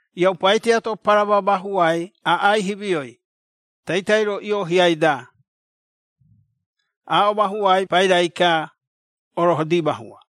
Iaupai tiato parama mahuai aꞌai himioi, taitai-ro ioohiai-da. Aaꞌo mahuai pairai-ka, Orohodi Mahua.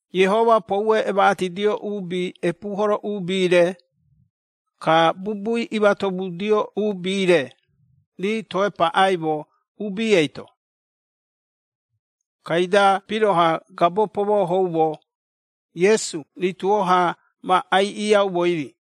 Iehoma poue emaꞌatidio uubi epuuhoro uubi-re, ka bubui imatomudio uubi-re, rii toe paꞌaimo uubi eito. Kaida piroha gabo pomohooumo, Iesu rituo-ha ma aiꞌiaumoi-ri.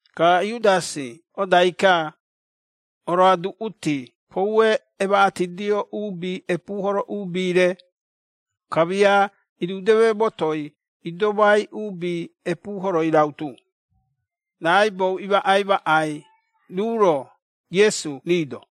Ka Iudasi odai-ka, oroaduꞌuti poue emaꞌatidio uubi epuuhoro uubi-re, kamia irudeme motoi idomai uubi epuuhoroi rautu, raꞌaibou imaꞌai maꞌai ruu-ro, Iesu rii-do.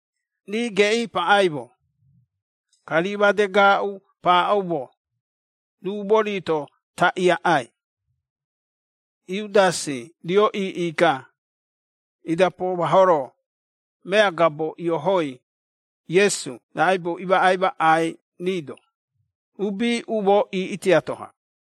Rii geꞌii paꞌaimo, ka rii made gaaꞌu paaꞌoumo, ruu mori-to taꞌii aꞌai. Iudasi rio iiꞌi-ka, ida poomahoro, mea gabo ioohoi, Iesu raꞌaibou imaꞌai maꞌai rii-do, uubi umoo iiꞌi tiato-ha.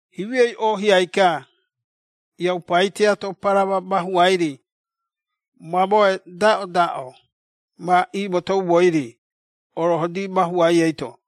Himioi oohiai-ka, iaupai tiato parama mahuai-ri, mamoe daꞌodaꞌo ma iimotoumoi-ri, Orohodi Mahuai eito.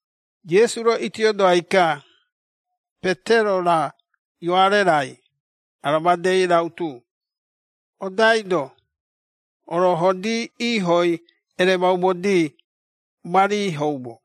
Iesu-ro itiodoai-ka, Petero-ra, Ioare-rai, ara madei rautu, “Odaido, Orohodi iihoi ereemaumodi, ma riihoumo.”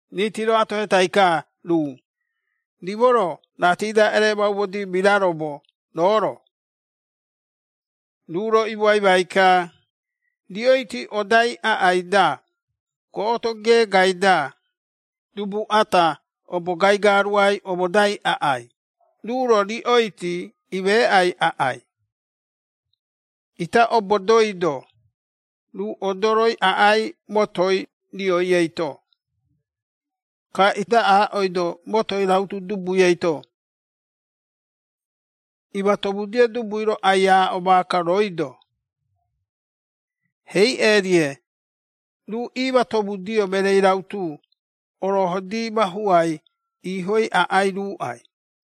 Riiti-ro atohetai-ka ruu, “Rimo-ro ratii-da ereemaumodi miraromo, roo-ro?” Ruu-ro imoaimai-ka, “Riꞌoiti odai aꞌai-da, goꞌoto geegai-da, dubu ata obo gaigaruai omodai aꞌai, ruu-ro riꞌoiti imeeꞌai aꞌai. Ita obodoido, ruu odoroi aꞌai motoi rioi eito. Ka ita aaꞌoido motoi rautu dubui eito, ‘Imatomudio dubui-ro ai-aaꞌo maaka rooi-do, “Heiꞌe-rie, ruu iimatomudio mereei rautu Orohodi Mahuai iihoi aꞌai ruuꞌai?”’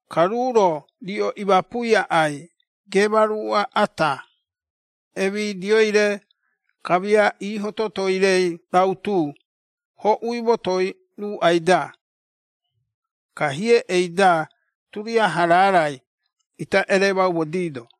Ka ruu-ro riꞌo imapui aꞌai geema ruuꞌa ata, emidioi-re, kamia iiho totoi-rei rautu, hoꞌui motoi ruuꞌai-da. Ka hieꞌei-da turiaha raarai ita ereemaumodiido.”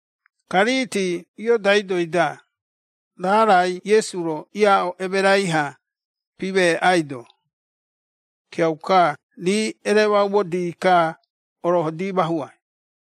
Ka riiti iodaidoi-da, raarai Iesu-ro iaaꞌo emerai-ha, pimeeꞌaido. Kiauka rii eremaumodi-ka, Orohodi Mahuai.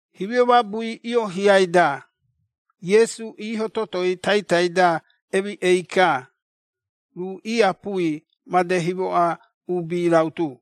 Himio mabui ioohiai-da, Iesu iiho totoi taitai-da emiꞌei-ka, ruu iiapui made himoꞌa uubi rautu.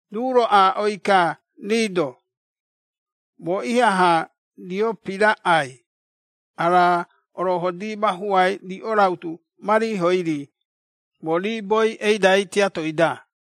Ruu-ro aaꞌoi-ka rii-do, “Moo ihaha rio piraꞌai ara Orohodi Mahuai riꞌo rautu ma riihoi-ri, moo riiboi eidai tiatoi-da!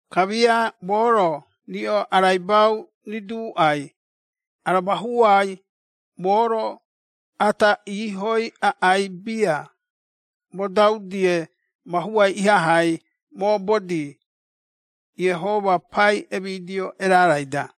Kamia moo-ro riꞌo araibau riduuꞌai, ara mahuai moo-ro ata iihoi aꞌai bia, modau-die mahuai ihahai moobodi, Iehoma pai emidio erarai-da!”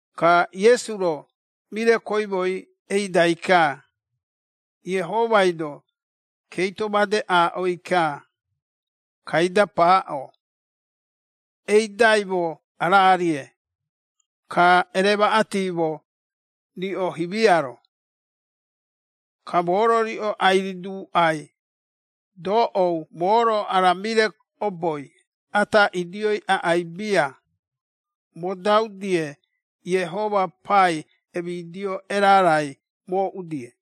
Ka Iesu-ro mire koimoi eidai-ka, Iehomai-do keito made aaꞌoi-ka, kaida paaꞌo, “Eidaimo araa-rie, ka ereemaꞌatimo riꞌo himia-ro. Ka moo-ro riꞌo ai-riduuꞌai, doꞌou moo-ro ara mire oboi ata idioi aꞌai bia, modau-die Iehoma pai emidio erarai mooꞌu-die.”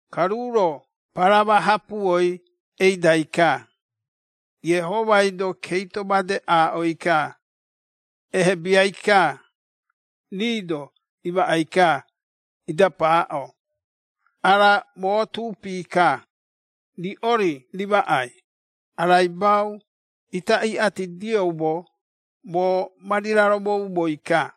Ka ruu-ro parama hapuoi eidai-ka, Iehomai-do keito made aaꞌoi-ka, ehebiai-ka, rii-do imaꞌai-ka, ida paaꞌo, “Ara moo tuupi-ka, riꞌo-ri rimaꞌai, araibau ita iꞌatidioumo, moo ma riraromoumoi-ka.”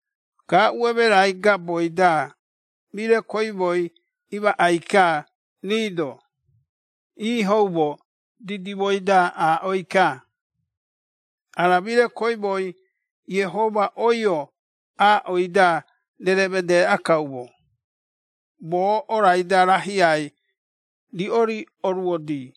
Gaaꞌu emerai gaboi-da, mire koimoi imaꞌai-ka rii-do, iihoumo didimoi-da aaꞌoi-ka, “Ara mire koimoi Iehoma oio aaꞌoi-da rereemedeeꞌa kaumo, moo orai-da rahiai, riꞌo-ri oruodii.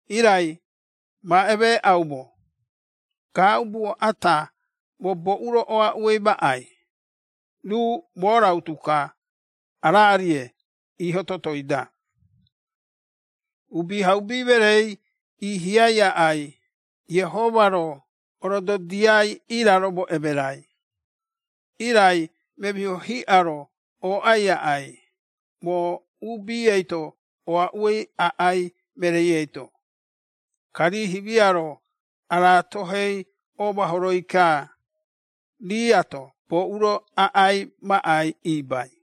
“Irai ma emeeꞌaumo, gaaꞌubuo ata, moo oaꞌuei aꞌai mereei, ruu moo rautu-ka, araa-rie iiho totoi-da. Uubihaubi Mereei iihiai aꞌai, Iehoma-ro orododiai iiraromo emerai, irai memiho hiꞌa-ro ooꞌai aꞌai, moo uubi eito oaꞌuei aꞌai mereei eito.” Ka rii himia-ro araatohei oomahoroi-ka, riiato boꞌu-ro aꞌai maꞌai ibai.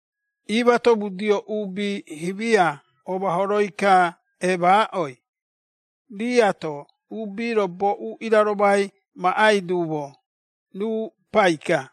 Iimatomudio uubi himia oomahoroi-ka eemaaꞌoi, riiato uubi-ro boꞌu iraromai maꞌai duumo, ruu pai-ka.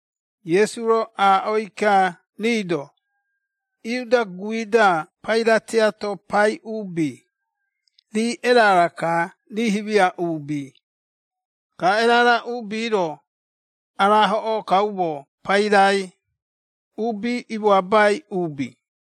Iesu-ro aaꞌoi-ka rii-do, “Iuda guui-da paira tiato pai uubi, rii erara-ka rii himia uubi, ka erara uubi-ro, araahoꞌoo kaumo pairai, ‘uubi imoabai uubi’.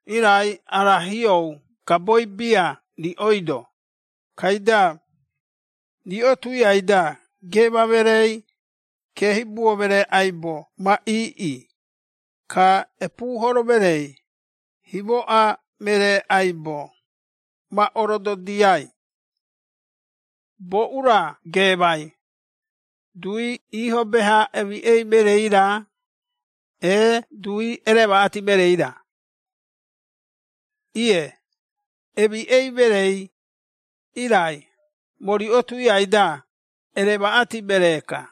Irai ara hiou gaboi bia riꞌoi-do, kaida, riꞌo tuiai-da geema mereei, keehibuo meree aibo ma iiꞌi, ka epuuhoro mereei, himoꞌa meree aibo, ma orododiai. Boꞌu-ra geemai, dui iiho beha emiꞌei mereei-ra, ee dui ereemaꞌati mereei-ra? Ie, emiꞌei mereei, irai moo riꞌo tuiai-da, ereemaꞌati meree-ka.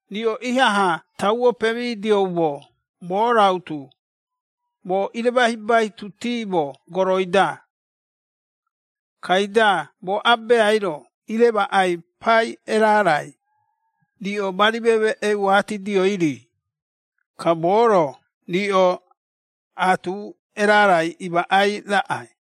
“Riꞌo ihaha tauo pemidioumo moo rautu, moo iremahibaitutiimo goroi-da. Kaida moo Abeai-ro iremaꞌai pai erarai, riꞌo ma rimemeꞌeuatidioi-ri, ka moo-ro riꞌo, aatu erarai imaꞌai raꞌai.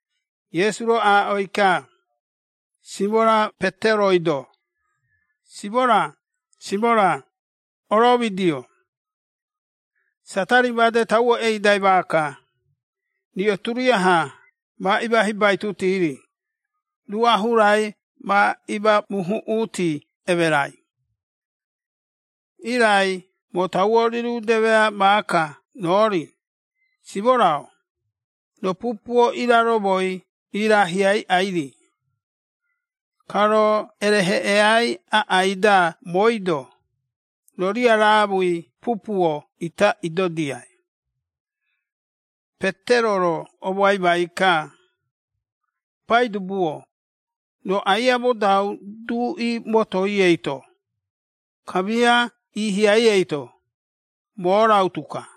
Iesu-ro aaꞌoi-ka, Simora Peteroi-do, “Simora, Simora, oromidio! Satari made tauo eidai maaka, riꞌo turiaha ma imahibaitutui-ri, ruꞌa hurai ma imamuhuꞌuuti emerai. Irai moo tauo rirudemea maaka roo-ri, Simora-o, roo pupuo iraromoi iiraahiaiꞌai-ri. Ka roo ereheꞌeai aꞌai-da mooi-do, roo riaraamui pupuo ita idodiai.” Petero-ro omoaimai-ka, “Paidubu-o, roo aia modau duꞌi motoi eito, kamia iihiai eito, moo rautu-ka.”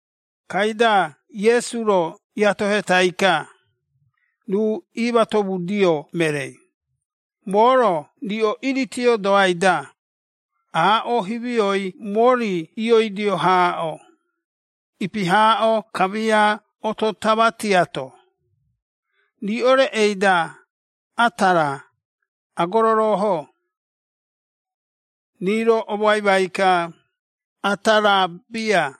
Kaida Iesu-ro iatohetai-ka, ruu iimatomudio mereei, “Moo-ro riꞌo iiritiodoai-da, aaꞌo himioi mori ioidio haaꞌo, ipi haaꞌo kamia oto tama tiato, riꞌo reꞌei-da ata raa, agororoohoo?” Rii-ro omoaimai-ka, “Ata raa bia.”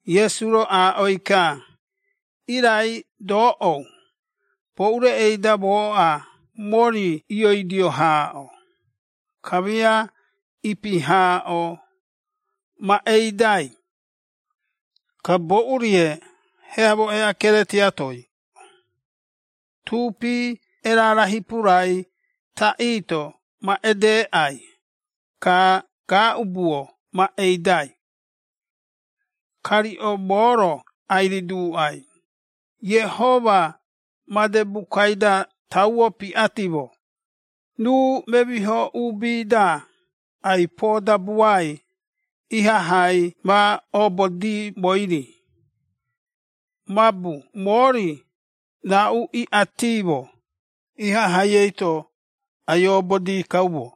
Iesu-ro aaꞌoi-ka, “Irai doꞌou, boꞌu reꞌei-da mooꞌa mori ioidio haaꞌo, kamia ipi haaꞌo, ma eidai, ka boꞌu-rie heamo eꞌakere tiatoi, tuupi erara hipurai taꞌii-to ma edeeꞌai, ka gaaꞌubuo ma eidai. Ka riꞌo moo-ro ai-riduuꞌai, Iehoma made bukai-da tauo piꞌatimo, ‘Ruu memiho uubi-da ai-poodabuai’, ihahai ma obodi moo-ri, mabu moo-ri, raꞌu iꞌatiimo, ihahai eito ai-obodii kaumo.”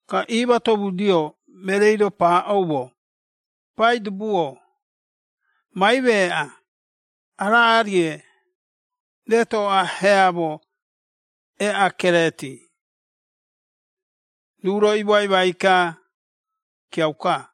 Ka iimatomudio mereei-ro paaꞌoumo, “Paidubu-o, ma imeeꞌa, araa-rie retoꞌa heamo eꞌakereeti.” Ruu-ro imoaimai-ka, “Kiauka.”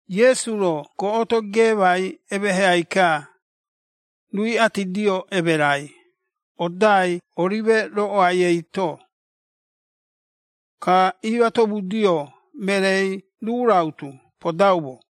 Iesu-ro goꞌoto geemai emeheai-ka, ruu iꞌatidio emerai, odai Orime Roꞌoai eito. Ka iimatomudio mereei ruu rautu podaumo.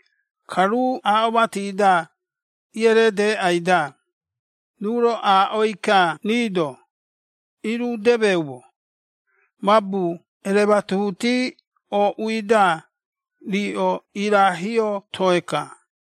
Ka ruu aaꞌo mati-da iereedeeꞌai-da, ruu-ro aaꞌoi-ka rii-do, “Irudemeumo, mabu erematuhuti ooꞌui-da, riꞌo iiraahio toe-ka.”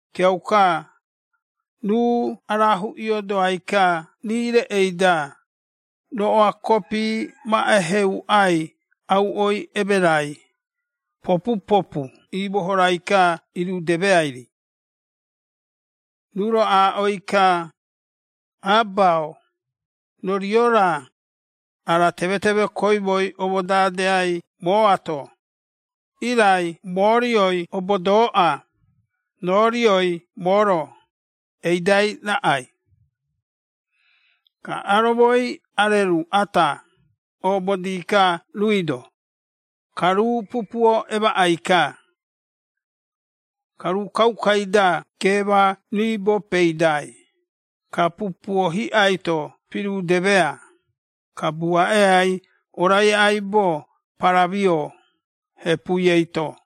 Kiauka, ruu araahuꞌiodoai-ka rii reꞌei-da, roꞌoa kopi ma eheuꞌai auꞌoi emerai, popu-popu iimohorai-ka irudemeai-ri. Ruu-ro aaꞌoi-ka, “Aba-o, roo rio-ra, ara temeteme koimoi omodadeai mooato, irai moo rioi obodooꞌa, roo rioi moo-ro eidai raꞌai.” Ka aromoi areru ata oobodii-ka ruui-do, ka ruu pupuo emaꞌai-ka. Ka ruu kaukai-da geema riibo peidai, ka pupuo hiꞌai-to pirudemea, ka buaꞌeai orai aibo paramio, hepui eito.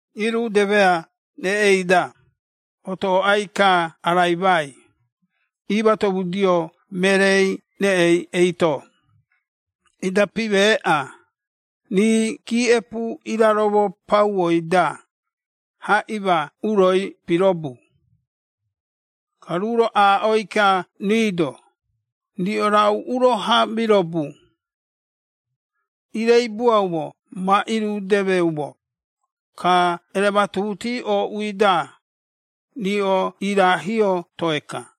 Irudeme reꞌei-da, otooꞌai-ka araimai, iimatomudio mereei reꞌei eito, ida pimeeꞌa, rii giiꞌepu iraromo pauoi-da, haꞌima uroi pirobu. Ka ruu-ro aaꞌoi-ka rii-do, “Riꞌo raꞌu uro-ha mirobu? Ireibuaumo ma irudemeumo, ka erematuhuti ooꞌui-da, riꞌo iiraahio toe-ka.”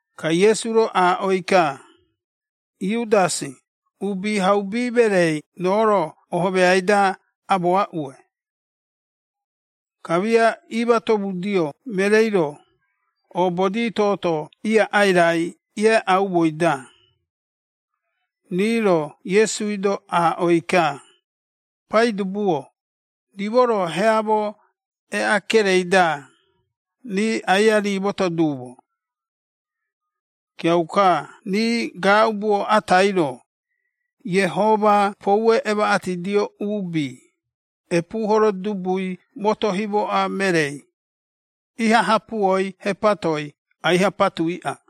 Ka Iesu-ro aaꞌoi-ka, “Iudasi, Uubihaubi Mereei roo-ro ohomeai-da amoaꞌue?” Kamia iimatomudio mereei-ro, oobodi tooto iaꞌai rai ieaꞌaumoi-da, rii-ro Iesui-do aaꞌoi-ka, “Paidubu-o, rimo-ro heamo eꞌakerei-da, rii aia rimooto duumo?” Kiauka rii gaaꞌubuo atai-ro, Iehoma poue emaꞌatidio uubi, epuuhoro dubui moto himoꞌa mereei, iha hapuoi hepatoi aiha patuiꞌa.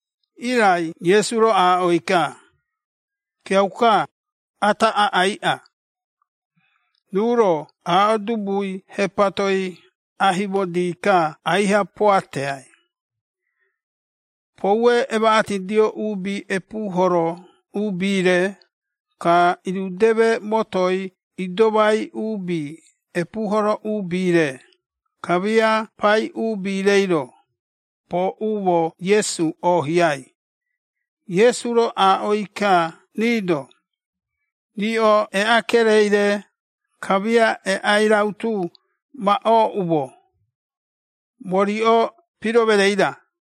Irai Iesu-ro aaꞌoi-ka, “Kiauka, ata aꞌaiꞌa.” Ruu-ro aaꞌo dubui hepatoi aihimodi-ka aiha poateai. Poue emaꞌatidio uubi epuuhoro uubi-re, ka irudeme motoi idomai uubi epuuhoro uubi-re, kamia pai uubi-reiro, pooꞌumo Iesu oohiai, Iesu-ro aaꞌoi-ka rii-do, “Riꞌo eꞌakerei-re, kamia eꞌai rautu ma ooꞌumo, moo riꞌo piro mereei-ra?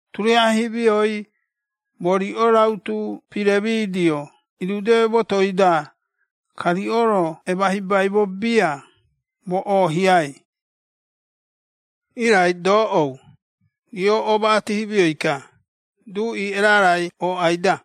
Turiaha himioi, moo riꞌo rautu piremidio irudeme motoi-da, ka riꞌo-ro emahibaimo bia, moo oohiai. Irai doꞌou, riꞌo omaꞌati himioi-ka, duꞌi erarai ooꞌai-da.”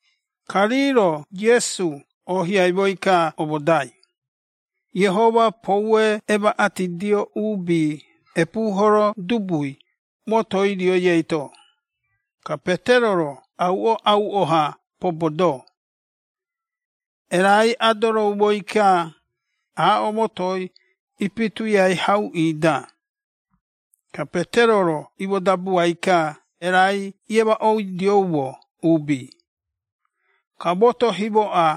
Ka rii-ro Iesu oohiaimoi-ka omodai, Iehoma poue emaꞌatidio uubi epuuhoro dubui motoi rioi eito, ka Petero-ro auoꞌauo-ha pobodoo. Erai adoroumoi-ka aaꞌo motoi ipituiai hauꞌii-da, ka Petero-ro imodabuai-ka erai iemaꞌoidioumo uubi. Ka moto himoꞌa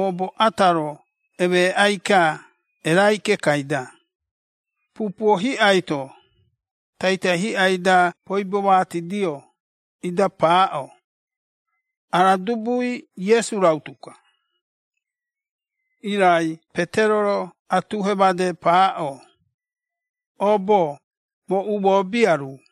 oobo ata-ro emeeꞌai-ka erai kekai-da, pupuo hiꞌai-to, taitai hiꞌai-da poibomatidio, ida paaꞌo, “Ara dubui Iesu rautu-ka.” Irai Petero-ro atuhe made paaꞌo, “Oobo, moo umoo bia ruu.”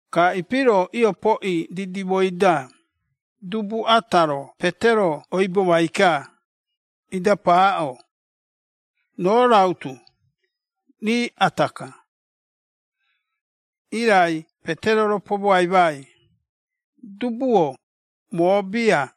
Ka ipi-ro iopoꞌi didimoi-da, dubu ata-ro Petero oibomai-ka, ida paaꞌo, “Roo rautu, rii ata-ka!” Irai Petero-ro pomoaimai, “Dubu-o, moo bia.”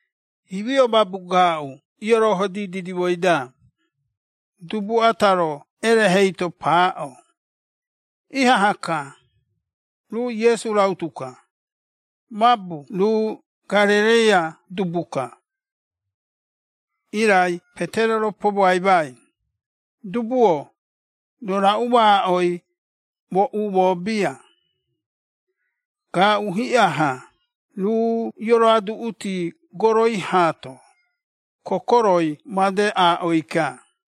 Himio mabu gaaꞌu iorohodi didimoi-da, dubu ata-ro erehei-to paaꞌo, “Ihaha-ka, ruu Iesu rautu ka, mabu ruu Garereia dubu-ka.” Irai Petero-ro pomoaimai, “Dubu-o, roo raꞌu maaꞌoi, moo umoo bia!” Gaaꞌu hiꞌa-ha ruu ioroaduꞌuti goroi haato, kokoroi madei aaꞌoi-ka.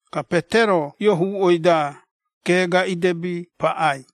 Ka Petero iohuuꞌoi-da, geega idebi paꞌai.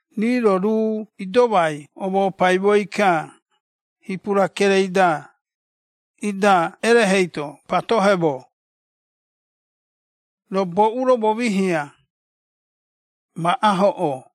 Rii-ro ruu idomai omopaimoi-ka, hipura kerei-da, ida erehei-to patoheemo, “Roo boꞌu-ro momihia? Ma ahoꞌoo!”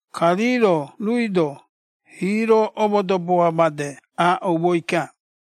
Ka rii-ro ruui-do, hiiro omodoboa made aaꞌoumoi-ka.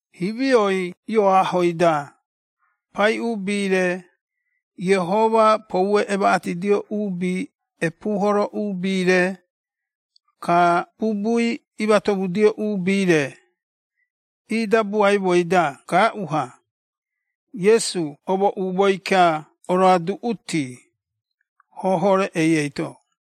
Himioi ioahoi-da, pai uubi-re, Iehoma poue emaꞌatidio uubi epuuhoro uubi-re, ka bubui imatomudio uubi-re, iidabuaimoi-da gaaꞌu-ha, Iesu omooꞌumoi-ka oroaduꞌuti, hoho reꞌei eito.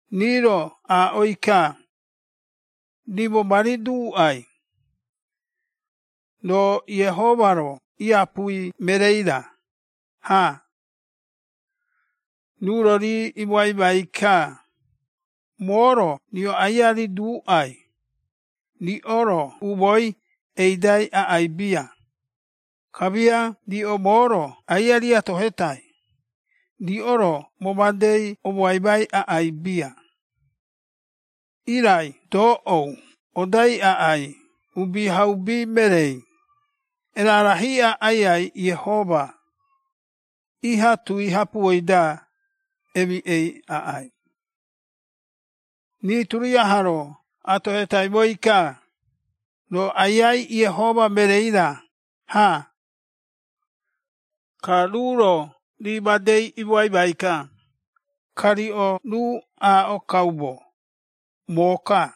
Rii-ro aaꞌoi-ka, “Rimo ma riduuꞌai, roo Iehoma-ro iapui mereei-ra, ha?” Ruu-ro rii imoaimai-ka, “Moo-ro riꞌo aia riduuꞌai, riꞌo-ro umooi eidai aꞌai bia, kamia riꞌo moo-ro aia riatohetai, riꞌo-ro moo madei omoaimai aꞌai bia. Irai doꞌou odai aꞌai Uubihaubi Mereei, erara hiꞌa Aiai Iehoma iha tui hapuoi-da, emiꞌei aꞌai.” Rii turiaha-ro atohetaimoi-ka, “Roo Aiai Iehoma mereei-ra, ha?” Ka ruu-ro rii madei imoaimai-ka, “Ka riꞌo ruu aaꞌo kaumo, moo-ka.”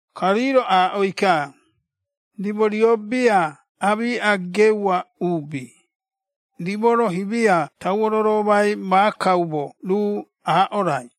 Ka rii-ro aaꞌoi-ka, “Rimo rio bia aamiꞌa geua uubi, rimo-ro himia tauo roromai maakaumo ruu aaꞌo rai!”